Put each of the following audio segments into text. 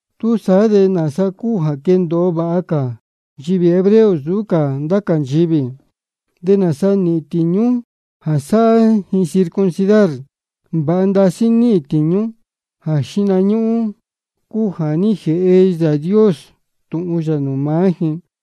¿Túsaá de nāsa cúu jā quéndōo vāha cā nchivī hebreo nsūú cá ndá cā nchivī? ¿De nāsa níhīn tīñú jā sáhá ji circuncidar? Vāha ndasí níhīn tīñú. Jā xíhna ñúhún cúu jā ní jēhe Yāā Dios tūhun yā nūū maá ji.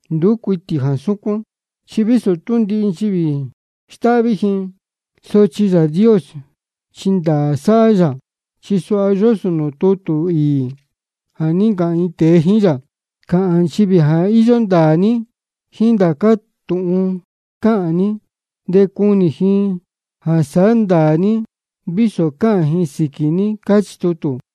Nduú cuitī jā súcuán. Chi vísō tú ndihi nchivī stáhví ji, sochi Yāā Dios chi ndāā sáhá yā. Chi suha yósō nūū tutū īī jā ní ncāhān iin tēe jíín yā: Cāhān nchivī jā íyó ndāā ní jíín ndācá tūhun cáhān ní, de cunī ji jā sáhá ndāā ní, vísō cáhān ji sīquī ní. Cáchī tutū.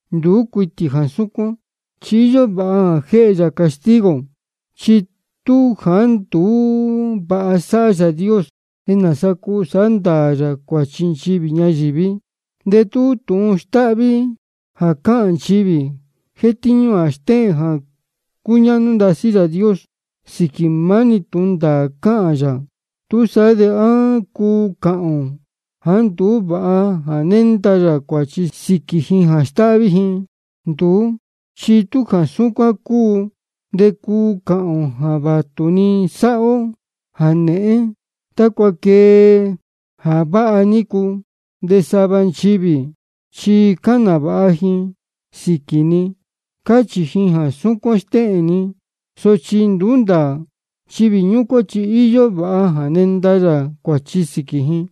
Nduú cuitī jā súcuán, chi íyó vāha jā jéhe yā castigo. Chi tú jāá nduú vāha sáhá Yāā Dios, ¿de nāsa cuu sāhá ndāā yā cuāchi nchivī ñayīví? De tú tūhun stáhví jā cáhān nchivī jétíñú jā stéhēn jā cúñáhnú ndasí Yāā Dios sīquī jā maá-ni tūhun ndāā cáhān yā, ¿túsaá de á cuu cāhān ō jāá nduú vāha jā nénda yā cuāchi sīquī ji jā stáhví ji? Nduú, chi tú jā súcuán cúu, de cuu cāhān ō jā vātu-ni sāhá ó jā nēhén tácua quee jā váha nícu. De sava nchivī chi cáhān nāvāha ji sīquī ni, cáchī ji jā súcuán stéhēn ni, sochi nduú ndāā. Nchivī ñúcuán chi íyó vāha jā nenda yā cuāchi sīquī ji.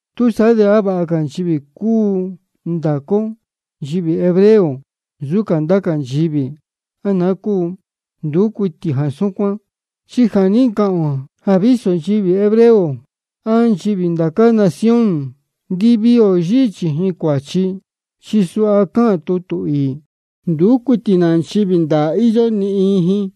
¿Túsaá de á vāha cā nchivī cúu ndācá ó nchivī hebreo nsūú cā ndá cā nchivī, á naá cúu? Nduú cuitī jā súcuán. Chi ja nī ncāhān ō jā vísō nchivī hebreo á nchivī ndá cā nación, ndiviī ō yíhí chījin cuāchi. Chi suha cáhān tutū īī: Nduú cuitī nā nchivī ndāā íyó, ni iin ji.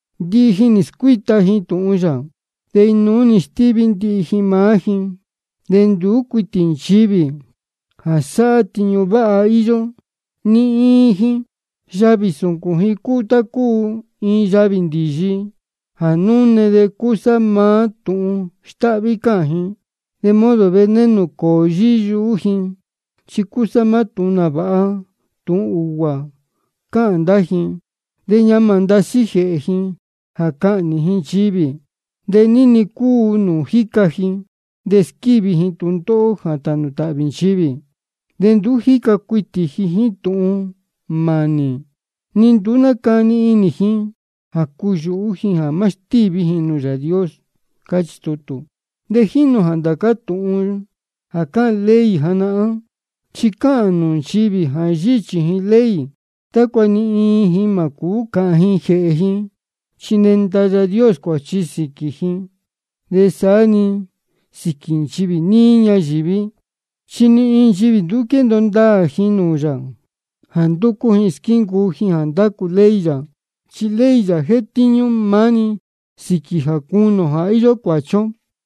Ndihi ji nī scuíta ji tūhun yā, de inuú-ni nī stíví ndihi ji maá ji. De nduú cuitī nchivī jā sáhá tiñu váha íyó, ni iin ji. Yavī sūcūn ji cúu tá cúu iin yavī ndīyi jā núne, chi cúsá maá tūhun stáhví cáhān ji. De modo veneno cōō yíhí yuhú ji, chi cúsá maá tūhun nāvāha tūhun ūguā cáhān ndá ji. De ñamā ndasí jēhē ji jā cahnī ji ndīyi. De ní-ni cúu nūū jíca ji de squívi ji tūndóhó jā tānū tāhvī nchivī. De nduú jíca cuitī ji jíín tūhun mānī, de ni nduú nácani inī ji jā cuyūhú ji jā má stíví ji nūū Yāā Dios. Cáchī tutū. De jínī ō jā ndācá tūhun jā cáhān ley janahán, chi cáhān nūū nchivī jā yíhí chījin ley, tácua ni iin ji mā cūú cāhān ji jēhē ji. Chi nenda Yāā Dios cuāchi sīquī ji, de saá-ni sīquī nchivī níí ñayīví. Chi ni iin nchivī nduú cúu quendōo ndāā ji nūū yā jā ndúcú ji squíncuu ji jā ndácu ley yā. Chi ley yā jétíñú maá-ni sīquī jā cunī ō jā íyó cuāchi ó.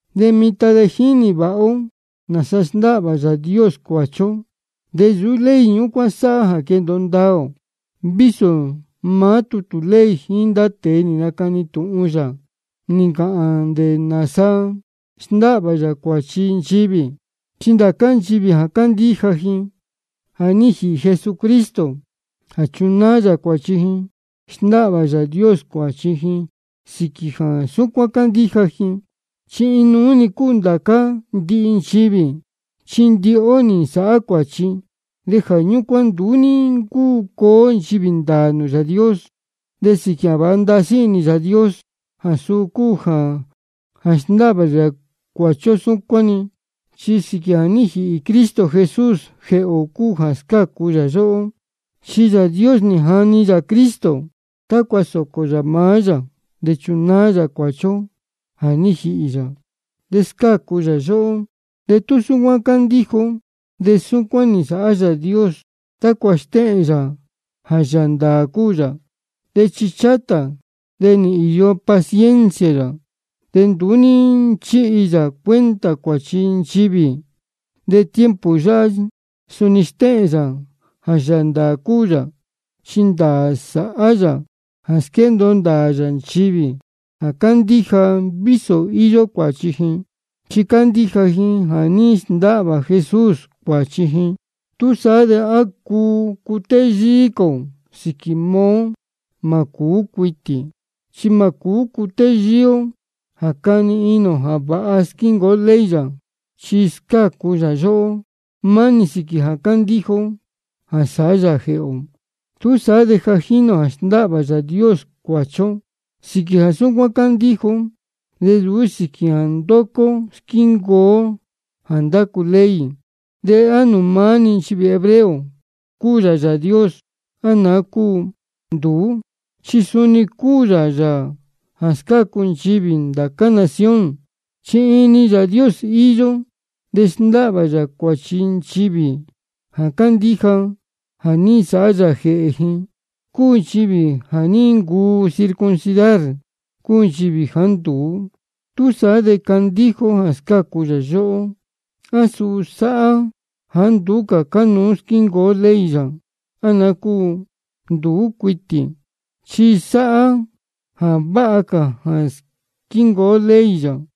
De mitan de ja jínī vāha ó nāsa sndáhvā Yāā Dios cuāchi ó. De nsūú ley ñúcuán sáhá jā quéndōo ndāā ō, vísō maá tutū ley jíín ndá tēe nī nacani tūhun yā, nī ncāhān ndá nāsa sndáhvā yā cuāchi nchivī. Chi ndācá nchivī jā cándíja ji jā ní jīhī Jesucristo jā chunáá yā cuāchi ji, sndáhvā Yāā Dios cuāchi ji sīquī jā súcuán cándíja ji. Chi inuú-ni cúu ndācá ndihi nchivī. Chi ndihi ó nī nsāhá cuāchi, de jā ñúcuán nduú ní ncúu cuu ó nchivī ndāā nūū Yāā Dios. De sīquī jā vāha ndasí inī Yāā Dios, jā suu cúu jā sndáhvā yā cuāchi ó súcuán-ni. Chi sīquī jā ní jīhī Cristo Jesús jēhē ō cúu jā scácu yā yóhó. Chi Yāā Dios nī jani yā Cristo tácua sōcō yā maá yā jā chunáá yā cuāchi ó jā ní jīhī yā. De scácu yā yóhó de tú súcuán candíja ó. De súcuán nī nsāhá Yāā Dios tácua stéhēn yā jā Yāā ndāā cúu yā. De ichi chátā de nī īyo paciencia yā, de nduú ní nchíhi yā cuenta cuāchi nchivī. De tiempo yáhá suni stéhēn yā jā Yāā ndāā cúu yā, chi ndāā sáhá yā jā squéndōo ndāā yā nchivī jā cándíja, vísō íyó cuāchi ji, chi cándíja ji jā ní sndáhvā Jesús cuāchi ji. ¿Túsaá de á cuu cutéyíí cā ō sīquī maá ó? Mā cūú cuitī, chi mā cūú cutéyíí ó jā cani inī ō jā vāha squíncuu ó ley yā. Chi scácu yā yóhó maá-ni sīquī jā cándíja ó jā sáhá yā jēhē ō. Túsaá de ja jínī ō jā sndáhvā Yāā Dios cuāchi ó sīquī jā súcuán cándíja ó, de nsūú sīquī jā ndúcú ó squíncuu ó jā ndácu ley. ¿De á nūū maá-ni nchivī hebreo cúu yā Yāā Dios, á naá cúu? Nduú, chi suni cúu yā Yāā jā scácu nchivī ndá cā nación. Chi iin-ni Yāā Dios íyó, de sndáhvā yā cuāchi nchivī jā cándíja jā ní nsāhá yā jēhē ji, cúu nchivī jā ní ncuu circuncidar, cúu nchivī jāá nduú. Túsaá de jā cándíja ó jā scácu yā yóhó, ¿á suu sáhá jāá nduú cā cánuú squíncuu ó ley yā, á naá cúu? Nduú cuitī, chi sa sáhá jā vāha cā cuu squíncuu ó ley yā.